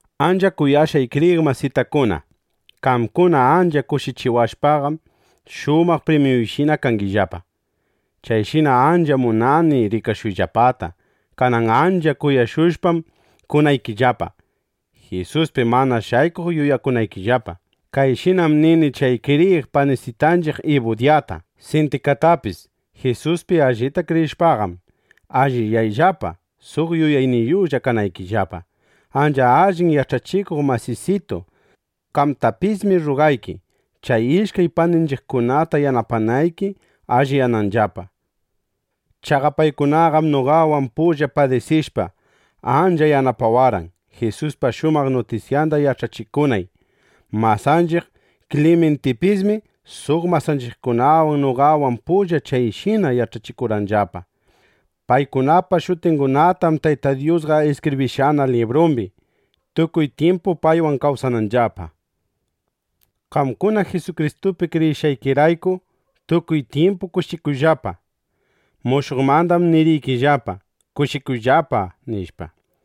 Ancha kuyashqay kriyiq masitakuna, qamkuna ancha kushichiwashpaqam, shumaq primyuyshina kangillapa. Chaymi ancha munani rikashuyllapata. Kanan ancha kuyashushpam kunaykillapa, Jisuspi mana shaykuq yuyakunaykillapa. Kayshinam nini chay kriyiq panisitanchiq Ibudyata, Sintikatapis: Jisuspi allipta kriyishpaqam, alliyayllapa, suq yuyayniyuqlla kanaykillapa. Ancha allin yach'achikuq masisitu, qamtapismi rrugayki, chay ishkay paninchiqkunata yanapanayki alliyananllapa. Chaqa paykunaqam noqawan pulla padisishpa, ancha yanapawarqan, Jisuspa shumaq nutisyanda yach'achikunay. Masanchiq Klimintipismi suq masanchiqkunawan noqawan pulla chayshina yach'achikurqanllapa. Paykunapa shutingunatam Tayta Dyusqa iskibrishqana librumbi, tukuy tyimpu paywan kawsananllapa. Qamkuna Jisukristupi kriyishqaykirayku, tukuy tyimpu kushikuyllapa. Mushuqmandam niriykillapa: ¡Kushikuyllapa! nishpa.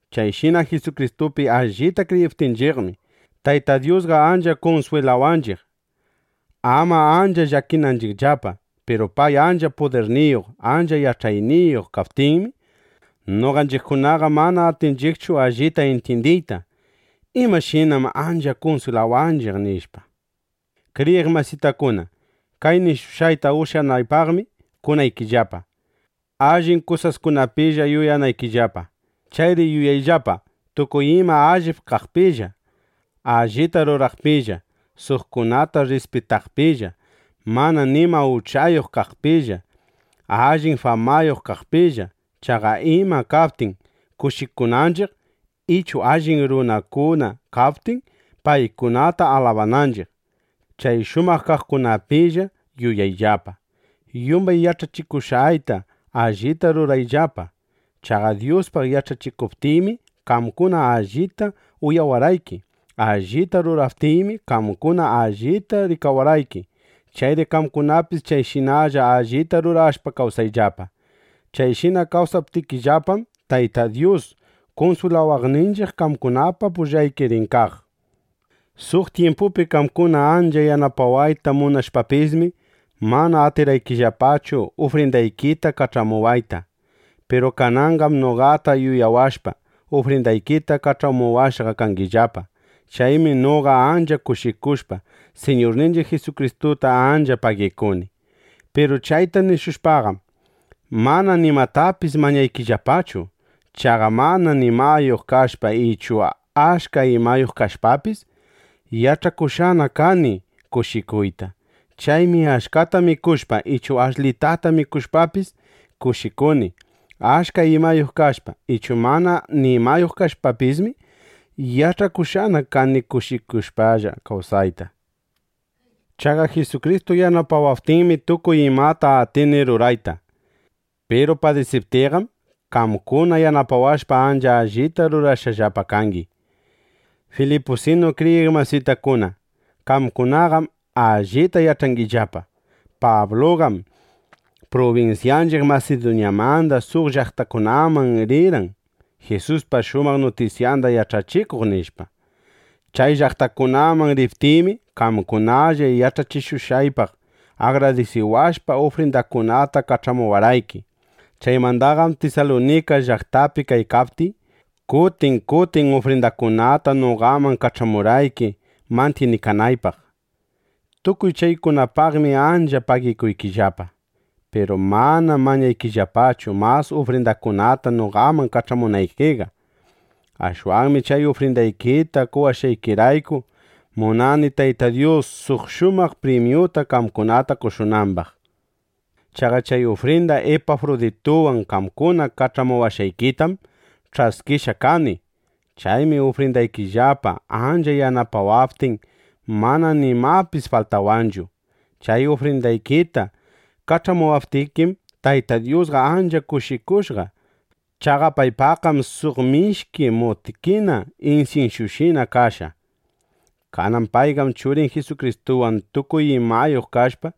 Chayshina Jisukristupi allita kriyiptinchiqmi, Tayta Dyusqa ancha kunswilawanchiq, ama ancha llakinanchiqllapa. Piru pay ancha pudirniyuq ancha yach'ayniyuq kaptinmi, noqanchiqkunaqa mana atinchiqchu allita intyindiyta: ¿Imashinam ancha kunswilawanchiq? nishpa. Kriyiq masitakuna, kay nishushqayta ushyanaypaqmi kunaykillapa, allin kusaskunapilla yuyanaykillapa. Chayri yuyayllapa tukuy ima allip kaqpilla, allita ruraqpilla, suqkunata rrispitaqpilla, mana nima uchayuq kaqpilla, allin famayuq kaqpilla. Chaqa ima kaptin kushikunanchiq, ichu allin runakuna kaptin, paykunata alabananchiq, chay shumaq kaqkunapilla yuyayllapa. Yumbay yach'achishushqayta allita rurayllapa. Chaqa Dyuspaq yach'achikuptiymi, qamkuna allita uyawarqayki; allita ruraptiymi, qamkuna allita rikawarqayki. Chayri qamkunapis chayshinalla allita rurashpa kawsayllapa. Chayshina kawsaptikillapam, Tayta Dyus kunswilawaqninchiq qamkunapa pullayki rin kaq. Suq tyimpupi qamkuna ancha yanapawayta munashpapismi, mana atirqaykillapachu ufrindaykita kach'amuwayta. Piru kananqam noqata yuyawashpa, ufrindaykita kach'amuwashqa kangillapa. Chaymi noqa ancha kushikushpa, Siñurninchiq Jisukristuta ancha pagikuni. Piru chayta nishushpaqam, mana nimatapis mañaykillapachu. Chaqa mana nimayuq kashpa ichu achka imayuq kashpapis, yach'akushqana kani kushikuyta. Chaymi achkata mikushpa ichu ashlitata mikushpapis kushikuni. Achka imayuq kashpa ichu mana nimayuq kashpapismi, yach'akushqana kani kushikushpalla kawsayta. Chaqa Jisukristu yanapawaptinmi, tukuy imata atini rurayta. Piru padisiptiyqam, qamkuna yanapawashpa, ancha allita rurashqallapa kangi. Filipusinu kriyiq masitakuna, qamkunaqam allita yach'angillapa: Pabluqam prubinsyanchiq Masiduñamanda suq llaqtakunaman rirqan, Jisuspa shumaq nutisyanda yach'achikuq, nishpa. Chay llaqtakunaman riptiymi, qamkunalla yach'achishushqaypaq agradisiwashpa, ufrindakunata kach'amuwarqayki. Chaymandaqam Tisalunika llaqtapi kaykaptiy, kutin kutin ufrindakunata noqaman kach'amurqayki mantyinikanaypaq. (Tukuy chaykunapaqmi ancha pagikuykillapa.) Piru manam mañaykillapachu, mas ufrindakunata noqaman kach'amunaykiqa. Ashwanmi chay ufrindaykita qowashqaykirayku, munani Tayta Dyus suq shumaq primyuta qamkunata qoshunambaq. Chaqa chay ufrinda Ipafrudituwan qamkuna kach'amushqaykitam ch'askishqa kani. Chaymi ufrindaykillapa ancha yanapawaptin, mana nimapis faltawanchu. Chay ufrindaykita kach'amuptikim, Tayta Dyusqa ancha kushikushqa. Chaqa paypaqqam suq mishki mutkina insinsyushina kashqa. Kanan payqam Churin Jisukristuwan tukuy imayuq kashpa,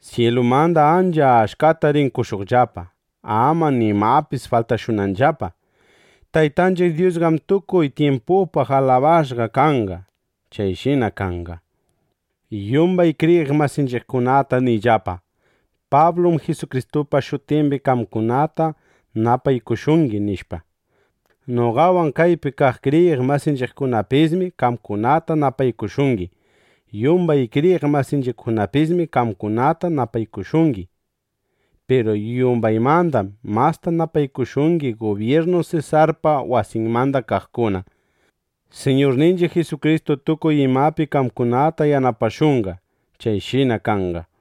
syilumanda ancha achkata rin qoshuqllapa, ama nimapis faltashunanllapa. ¡Taytanchiq Dyusqam tukuy tyimpupaq alabashqa kanqa! ¡Chayshina kanqa! Yumbay kriyiq masinchiqkunata niyllapa: “Pablum Jisukristupa shutimbi qamkunata napaykushungi”, nishpa. Noqawan kaypi kaq kriyiq masinchiqkunapismi qamkunata napaykushungi. Yumbay kriyiq masinchiqpismi qamkunata napaykushungi. Piru yumbaymandam masta napaykushungi gubyirnu Sesarpa wasinmanda kaqkuna. Siñurninchiq Jisukristu tukuy imapi qamkunata yanapashunqa. Chayshina kanqa.